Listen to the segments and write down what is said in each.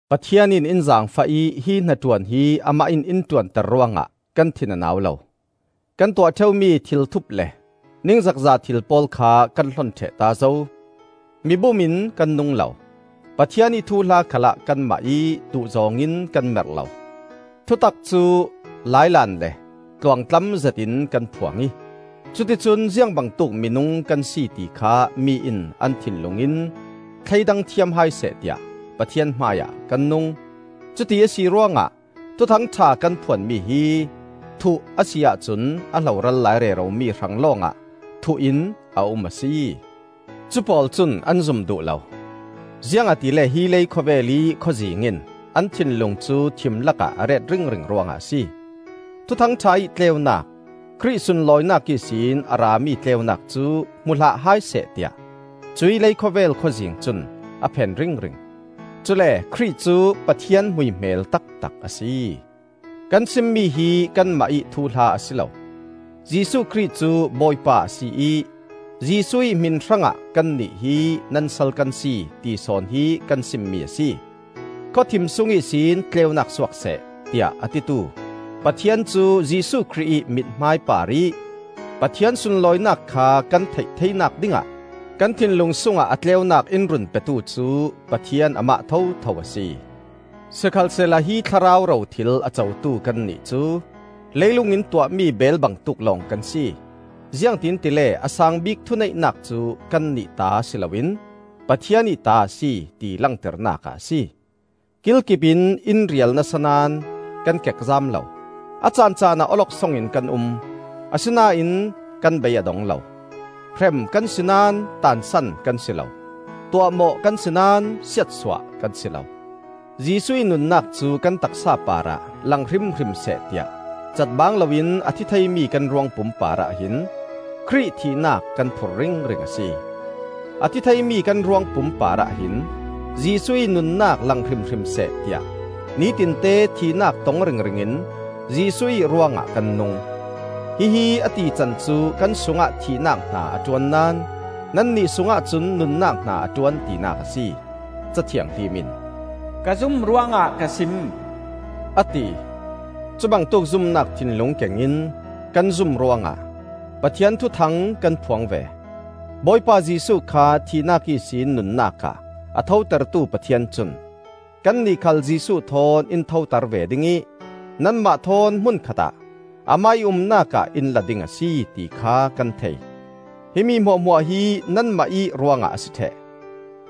Pathian in in zaangfah ih hi hnaṭuan hi Amah in in ṭuanter ruangah kan thin a nau lo. Kan tuah ṭheumi thilthup le ningzakza thil pawl kha kan hlon ṭhehta zo; mi bum in kan nung lo, Pathian ih thuhla khalah kanmah ih duhzawng in kan merh lo. Thutak cu lailan le tluangtlam zetin kan phuang ih cuticun ziangbangtuk minung kan si ti kha mi in an thinlung in thleidang thiam hai seh tiah Pathian hmaiah kan nung. Cuti a si ruangah Thuthang ṭha kan phuanmi hi thuh a si ahcun a hloral lai reromi hrang lawngah thuh in a um a si. Cupawl cun an zum duh lo, ziangahtile hi leikhawvel ih khawzing in an thinlung cu thim lakah a ret ringring ruangah a si. Thuthang ṭha ih tleunak, Khrih sunlawinak ihsin a rami tleunak cu hmu hlah hai seh tiah cuih leikhawvel khawzing cun a phen ringring. Cule Khrih cu Pathian hmuihmel taktak a si. Kan simmi hi kanmah ih thuhla a si lo; Jesuh Khrih cu Bawipa a si ih Jesuh ih hmin hrangah kannih hi nan sal kan si, ti sawn hi kan simmi a si. “Khawthim sung ihsin tleunak suak seh,” tiah a titu Pathian cu Jesuh Khrih ih mithmai parih Pathian sunlawinak kha kan theih theinak dingah kan thinlung sungah a tleunak in run petu cu Pathian amah thotho a si. Sikhalsehla hi thlarau rothil a cotu kannih cu leilung in tuahmi beel bangtuk lawng kan si; ziangtin tile a saang bik thuneihnak cu kannih ta si loin Pathian ih ta a si, ti langternak ah a si. Kil kipin in rial nasa naón kan kekzaam lo; a caancaan ah awloksong in kan um, asinain kan bei a dong lo. Hrem kan si naón taansan kan si lo; tuahmawh kan si naón siatsuah kan si lo. Jesuh ih nunnak cu kan taksa parah lang hrimhrim seh tiah catbaang loin a thi theimi kan ruangpum parah hin Khrih thihnak kan phur ringring a si. A thi theimi kan ruangpum parah hin Jesuh ih nunnak lang hrimhrim seh tiah nitinte thihnak tong ringring in Jesuh ih ruangah kan nung. Hihi a tican cu kan sungah thihnak hna a ṭuan naón nannih sungah cun nunnak hna a ṭuan tinak a si. Ca Thianghlim in, “Ka zum ruangah ka sim,” a ti. Cubangtuk zumnak thinlung kengin kan zum ruangah Pathian Thuthang kan phuang ve. Bawipa Jesuh kha thihnak ihsin nunnak ah a thotertu Pathian cun kannih khal Jesuh thawn in thoter ve ding ih nanmah thawn hmun khatah amah ih umnak ah in la ding a si, ti kha kan thei. Himi hmuahhmuah hi nanmah ih ruangah a si ṭheh.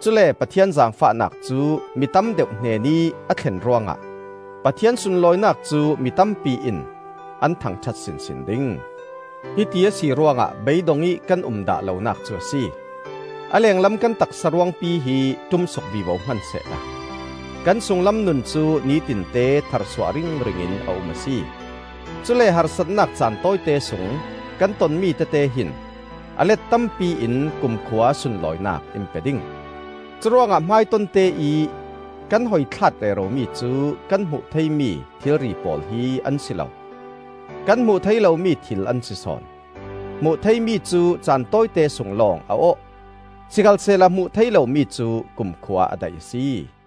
Cule Pathian zaangfahnak cu mi tam deuh hnenih a thlen ruangah, Pathian sunlawinak cu mi tampi in an thangṭhat sinsin ding. Hiti a si ruangah beidong ih kan um dah lonak cu a si. A lenglam kan taksa ruangpi hi ṭumsuk vivo hmansehla kan sunglam nun cu nitinte tharsuah ringringin a um a si. Cule harsatnak caan tawite sung kan tonmi tete hin a let tampi in kumkhua sunlawinak in pe ding. Curuangah hmaitonte ih kan hoithlat reromi cu kan hmuh theimi thilri pawl hi an si lo; kan hmuh thei lomi thil an si sawn. Hmuh theimi cu caan tawite sung lawng a awh; sikhalsehla hmuh thei lomi cu kumkhua a daih a si.